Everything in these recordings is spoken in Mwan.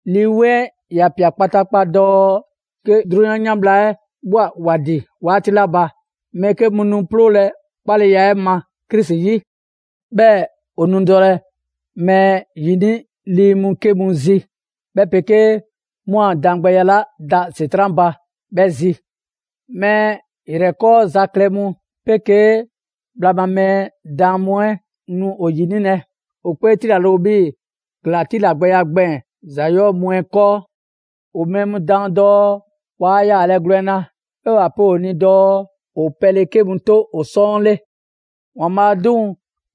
Lii 'Weŋ 'ɛ ‑ya ꞊pia kpataakpa dɔɔ 'ke 'drunyan 'yan bhla 'ɛ ꞊bhwa ‑wa ‑din 'waati 'la ba, mɛɛ 'ke mu nu 'ploolɛ‑ ‑o 'kpaleya 'ɛ ma Krisi 'yi; 'bhɛɛ‑ ‑o nu dɔlɛ mɛɛ ‑yini' lii mu 'ke mu zi, 'bhɛ 'pegee 'mu a daangbɛya 'la da ‑Setran' ba 'bhɛ zi. Mɛɛ ‑yrɛkɔɔza klɛ mu 'pegee bhla ma mɛɛ daan mu 'ɛ nu ‑o ‑yinilɛ. ‑O 'kpee 'ɛ 'tilale ‑o 'bhii‑ ‑gla tilagbɛya gbɛɛn‑ ‑za 'yɔɔ‑ mu 'ɛ 'kɔɔ. ‑O mɛɛ mu daan dɔɔ waa yaalɛ gwlɛn na, 'bhɛɛ‑ ‑wa pe ‑o ni dɔɔ ‑o pɛle 'ke mu 'to ‑o 'sɔɔn 'le. ‑Waanbhaa' 'duŋ‑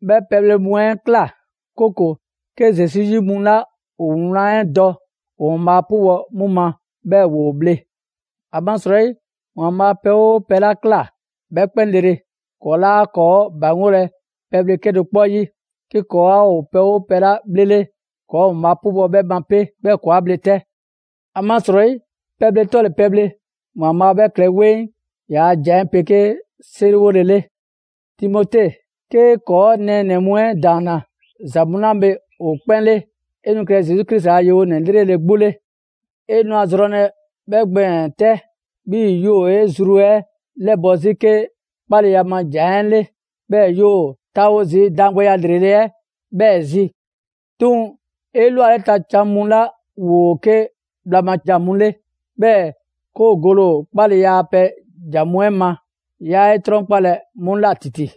'bhɛ pɛbhle mu 'ɛ ꞊kla, 'kooko‑ 'ke Zesu 'yi mu 'la ‑o wlan 'ɛ dɔ, ‑o ‑Waanbhaa' 'pubɔ‑ 'mu ma 'bhɛɛ‑ ‑woo bhle. ‑Amasrɔyi, ‑Waanbhaa' pɛ 'oo pɛ 'la ꞊kla 'bhɛ 'kpɛn lele; ‑kɔɔ' 'laa ‑kɔɔ' ‑baŋgolɛ pɛbhle 'kedo‑ 'kpɔ 'yi; 'ke ‑kɔɔ' ‑o pɛ 'oo pɛ 'la 'bhlele, ‑kɔɔ' ‑Waanbhaa' 'pubɔ‑ 'bhɛ ma 'pe, 'bhɛɛ‑ ‑kɔɔ' 'a bhle 'tɛ. ‑Amasrɔyi pɛbhle 'tɔle‑ pɛbhle, ‑Waanbhaa' 'bhɛ klɛ 'weŋ ‑yaa' ‑jan 'ɛ 'pegee 'seriwole 'le. Timote, 'kee ‑kɔɔ' nɛɛnɛ‑ mu 'ɛ ‑daanna ‑za mu 'la bhe ‑o 'kpɛn 'le, 'e nu klɛlɛ Zesu Krisi a yewonɛ 'lrele‑ 'gbu 'le. 'E nu ‑a zrɔnlɛ 'bhɛ gbɛɛn‑ 'tɛ 'bhii‑ 'yoo‑ 'e zru 'ɛ 'lɛbɔ 'zi 'ke 'kpaleya ma ‑jan 'ɛ 'le, 'bhɛɛ‑ 'yoo‑ 'taawo zii' daangbɛya ‑lrele' 'ɛ 'bhɛɛ‑ zi. 'Duŋ‑ 'elwaleta can mu 'la ‑woo 'ke bhla ma jan mu 'le, 'bhɛɛ‑ 'ke ‑o gole ‑o 'kpaleya a pɛ jan mu 'ɛ ma, 'yaa 'e 'trɔnkpalɛ 'mu ‑la ‑titi.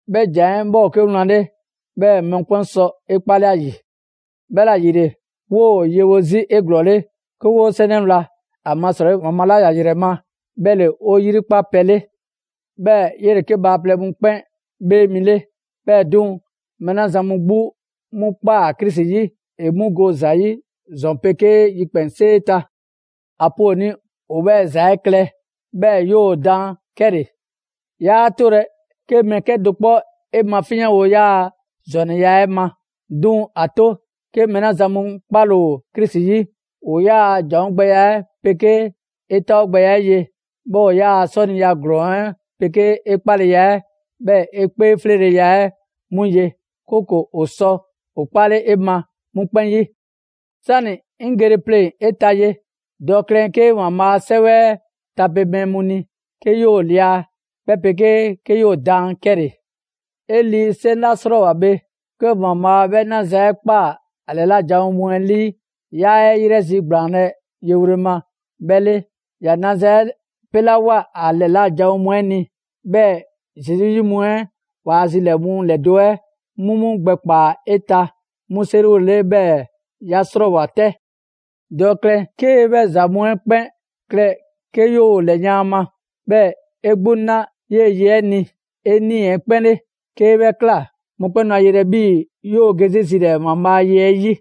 'Bhɛ ‑jan 'ɛ 'bhɛ ‑o 'ke wlan 'le, 'bhɛɛ‑ mɔkpɛn' sɔ 'e 'kpale ‑a ‑yi. 'Bhɛla‑ ‑yile, 'woo‑ yewo 'zi 'eglɔɔle 'ke 'woo 'sɛnɛ wla, ‑amasrɔyi ‑Waanbhaa' 'la ‑ya ‑yrɛ ma 'bhɛ ‑le 'o 'yrikpapɛ 'le; 'bhɛɛ‑ 'yele‑ 'ke bhaaplɛŋ mu 'kpɛn 'Bhee mi 'le, 'bhɛɛ‑ 'duŋ‑ mɛɛ 'la zan mu 'gbu 'mu 'kpaa‑ Krisi 'yi, ‑e 'mu go ‑za 'yi ‑zɔn 'pegee yikpɛnsee ta. ‑A pe ‑o ni ‑o 'bhɛɛ‑ ‑za 'ɛ klɛ, 'bhɛɛ‑ 'yoo‑ daan 'kɛle‑. 'Yaa 'tolɛ‑ 'ke mɛɛ 'kedo‑ 'e mafinyanwo 'yaa‑ ‑zwannɛya 'ɛ ma. 'Duŋ‑ ‑a 'to 'ke mɛɛ 'la zan mu 'kpale‑ ‑o Krisi 'yi, ‑o 'yaa‑ ‑janwo' gbɛya 'ɛ 'pegee 'e 'taawogbɛya ye, 'bhɛɛ‑ ‑o 'yaa‑ 'sɔniya ‑glɔɔn 'pegee 'e 'kpaleya 'ɛ, 'bhɛɛ‑ 'e 'kpee 'fleeleya 'ɛ 'mu ye; 'kooko‑ ‑o sɔ ‑o 'kpale 'e ma 'mu 'kpɛn 'yi. 'Sani‑ 'ŋ gele pleŋ‑ 'e ta ye, dɔ klɛn 'kee‑ ‑Waanbhaa' a 'Sɛwɛ 'ɛ tape mɛɛ mu ni, 'ke 'yoo‑ lia 'bhɛ 'pegee 'ke 'yoo‑ daan 'kɛle‑. 'E Lii 'seŋ 'la 'srɔɔwoa‑ bhe, 'ke ‑Waanbhaa' 'bhɛ 'naza‑ 'ɛ ꞊kpaa ‑a ‑lɛla' janwo mu 'ɛ 'lii, 'yaa 'e 'yrɛ zi ‑gblaanlɛ' yewole ma 'bhɛ 'le‑. ‑Ya naza 'ɛ 'pelawoa ‑a ‑lɛla janwo mu 'ɛ ni, 'bhɛɛ‑ Zesu 'yi mu 'ɛ ‑waa' zilɛɛ‑ mu ‑lɛdo' 'ɛ 'mu 'mu gbɛkpaa‑ 'e ta 'mu 'seriwolele, 'bhɛɛ‑ ‑ya 'srɔɔwoa‑ 'tɛ. Dɔ klɛn 'kee 'bhɛ ‑za mu 'ɛ 'kpɛn klɛ 'ke 'yoo‑ 'lɛyan‑ ‑a ma; 'bhɛɛ‑ 'e 'gbu 'na 'yee‑ ye 'ɛ ni 'e nii‑ 'ɛ 'kpɛn 'le. 'Ke 'bhɛ ꞊kla, mɔkpɛn' nu ‑a yelɛ 'bhii‑ 'yoo‑ ge 'zi zilɛɛ‑ ‑Waanbhaa a ye 'ɛ 'yi.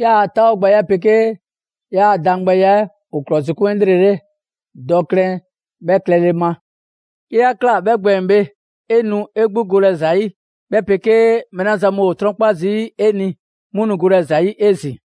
'Yaa‑ 'taawogbɛya 'pegee 'yaa‑ daangbɛya 'ɛ ‑o ‑klɔsikun 'elrele. Dɔ klɛn 'bhɛ klɛle ma. 'Ke 'ya ꞊kla 'bhɛ gbɛɛn‑ bhe, 'e nu 'e 'gbu golɛ ‑za 'yi, 'bhɛ 'pegee mɛɛ 'la zan mu ‑o 'trɔnkpa zii' 'e ni, 'mu nu golɛ ‑za 'yi 'ezin‑.